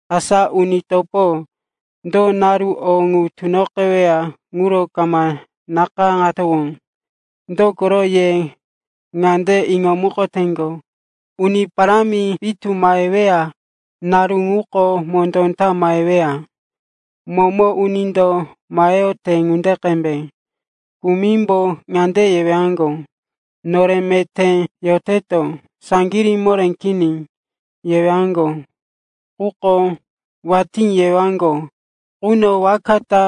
Asa, uni topo, do naru o ŋu tunoqeweya ŋuro kama nakayáŋowano. Dokoro ye ŋande iŋomukoteŋgo, Uni Parámi pitu maheweya naru ŋuko mondó ta maheweya, momo unindo maheyote ŋunde qembe. Kumimbo ŋande yewaŋgo, nore meté yoteto, saŋgirí moré kini, yewaŋgo. Quko watí yewaŋgo quno waka ta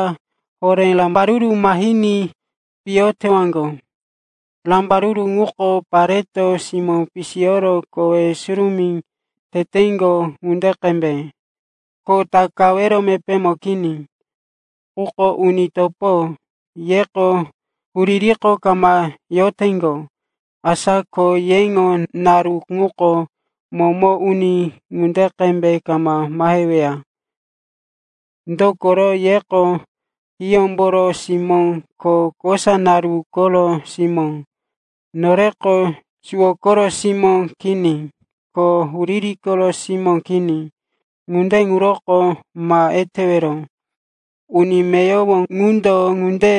horé rambaruru mahiní piyo tewaŋgo. Rambaruru ŋuko pareto simó pisiyoro kowe surumí teteŋgo ŋunde qembe, ko takawero mepémo kini. Quko uni topo, yeko huririko kama yoteŋgo. Asa ko yeŋo naru ŋuko momo uni ŋunde qembe kama maheweya. Dokoro yeko hiyómboro simó ko kosa naru koro simó. Noreko suwo koro simó kini ko huriri koro simó kini. Ŋunde ŋuroko ma etewero. Uni meyowo ŋundo ŋunde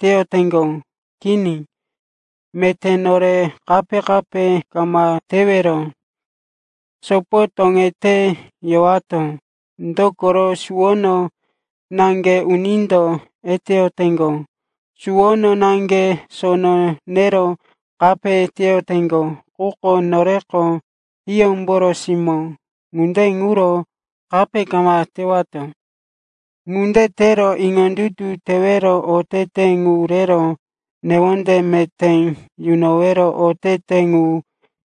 teyoteŋgo. Kini, meté nore kape-kape kama tewero, sopo toŋete yowato. Dokoro suwono naŋge unindo eteyoteŋgo, ko suwono naŋge sono nero kape teyoteŋgo. Quko noreko hiyómboro simó. Ŋunde ŋuro kape kama tewato. Ŋunde tero iŋondutu tewero otete ŋu rero newonde meté yunowero otete ŋu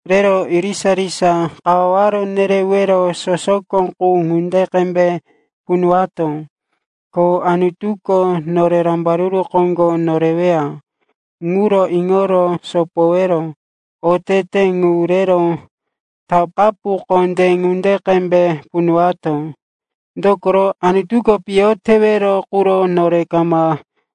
rero irisa-irisa kawaware nerewero sosoko qu ŋunde qembe punuwato. Ko Anutuko nore rambaruru koŋgo noreweya ŋuro iŋoro sopowero otete ŋu rero takapu kondé ŋunde qembe punuwato. Dokoro Anutuko piyo tewero quro nore kama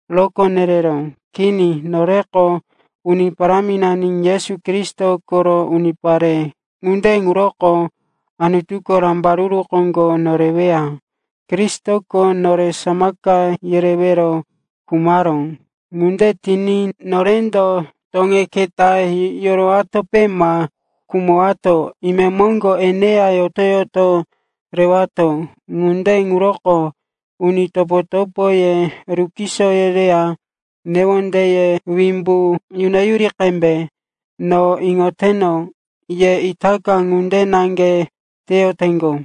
rokó yereró. Kini, noreko Uni Paráminani Yesu Kristo koro unipare. Ŋunde ŋuroko Anutuko rambaruru koŋgo noreweya. Kristoko nore samaka yerewero khumaró. Ŋunde tiní norendo toŋe keta yorowatope ma khumatowó, imemoŋgo eneya yoto-yoto rewato. Ŋunde ŋuroko uni topo-topoye rukiso yereya newondeye wimbu inoyuri qembe. No iŋoteno, ye itaka ŋunde naŋge teyoteŋgo.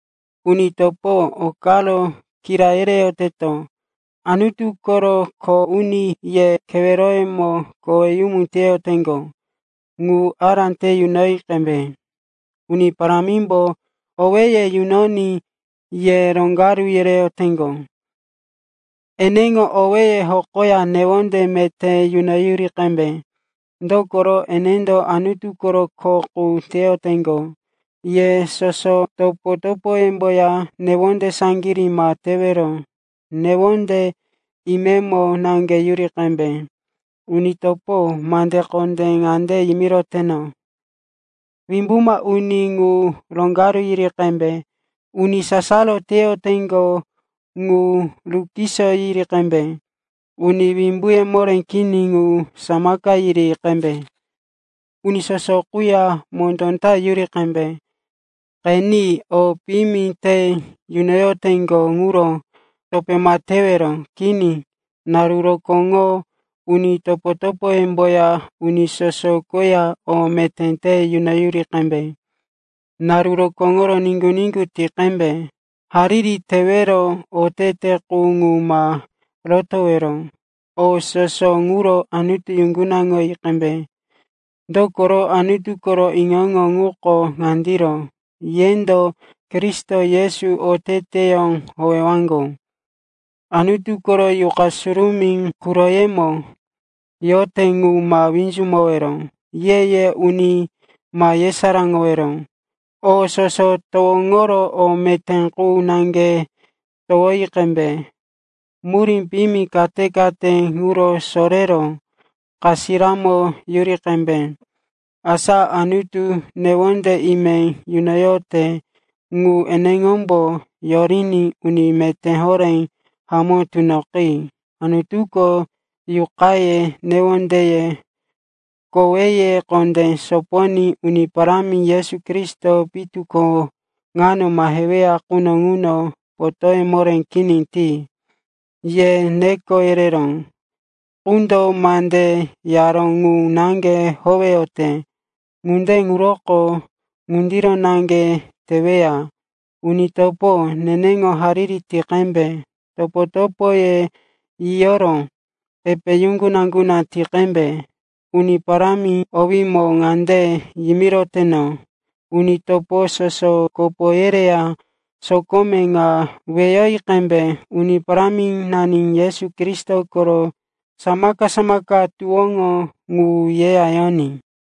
Uni topo, o karo kira yereyoteto. Anutu koro kho uni ye keweroyemo koweyumu teyoteŋgo ŋu ará te yunoyi qembe. Uni Parámimbo owéye yunoní ye roŋgaru yereyoteŋgo. Eneŋo owéye hokoya newonde meté yunoyuri qembe. Dokoro enendo Anutu koro kho qu teyoteŋgo. Ye soso topo-topoyemboya newonde saŋgirí ma tewero, newonde imemo naŋge yuri qembe. Uni topo, mande kondé ŋande yimiroteto, wimbuma uni ŋu roŋgaru yiri qembe, uni sasaro teyoteŋgo ŋu rukiso yiri qembe, uni wimbuye moré kini ŋu samaka yiri qembe, uni soso quya mondó ta yuri qembe. Qeni, o piyimi te yunoyoteŋgo ŋuro topé ma tewero. Kini, naru rokóŋo uni topo-topoyemboya uni soso koya o meté te yunoyuri qembe. Naru rokóŋo niŋgu-niŋgu ti qembe. Hariri tewero otete qu ŋu ma rotowero. O soso ŋuro Anutu yuŋgunaŋi qembe, dokoro Anutu koro iŋo-iŋo ŋuko ŋandiro, yendo Kristo Yesu oteteyó howewaŋgo. Anutu koro Yuqa Surumí quroyemo yote ŋu ma winzumowero. Ye-ye uni ma yesaráŋowero. O soso towoŋoro o meté qu naŋge towoyi qembe. Murí piyimi kate-kate ŋuro sorero kapiyamo yuri qembe. Asa Anutu newonde ime yunoyote ŋu eneŋombo yoriní uni meté horé hamó tunoqi. Anutuko yuqaye, newondeye, koweye kondé soponí Uni Parámi Yesu Kristo pitu ko ŋano maheweya quno ŋuno potóye moré kini ti. Ye neko yereró qundo mande yaró ŋu naŋge howeyote. Ŋunde ŋuroko ŋundiro naŋge teweya. Uni topo, neneŋo hariri ti qembe. Topo-topoye yiyoro epe yuŋguna-yuŋguna ti qembe. Uni Parámi owímo ŋande yimiroteno, uni topo soso kopo yereya sokome ŋa weyoyi qembe. Uni Paráminani Yesu Kristo koro samaka-samaka tuwóŋo ŋu yeya yoní.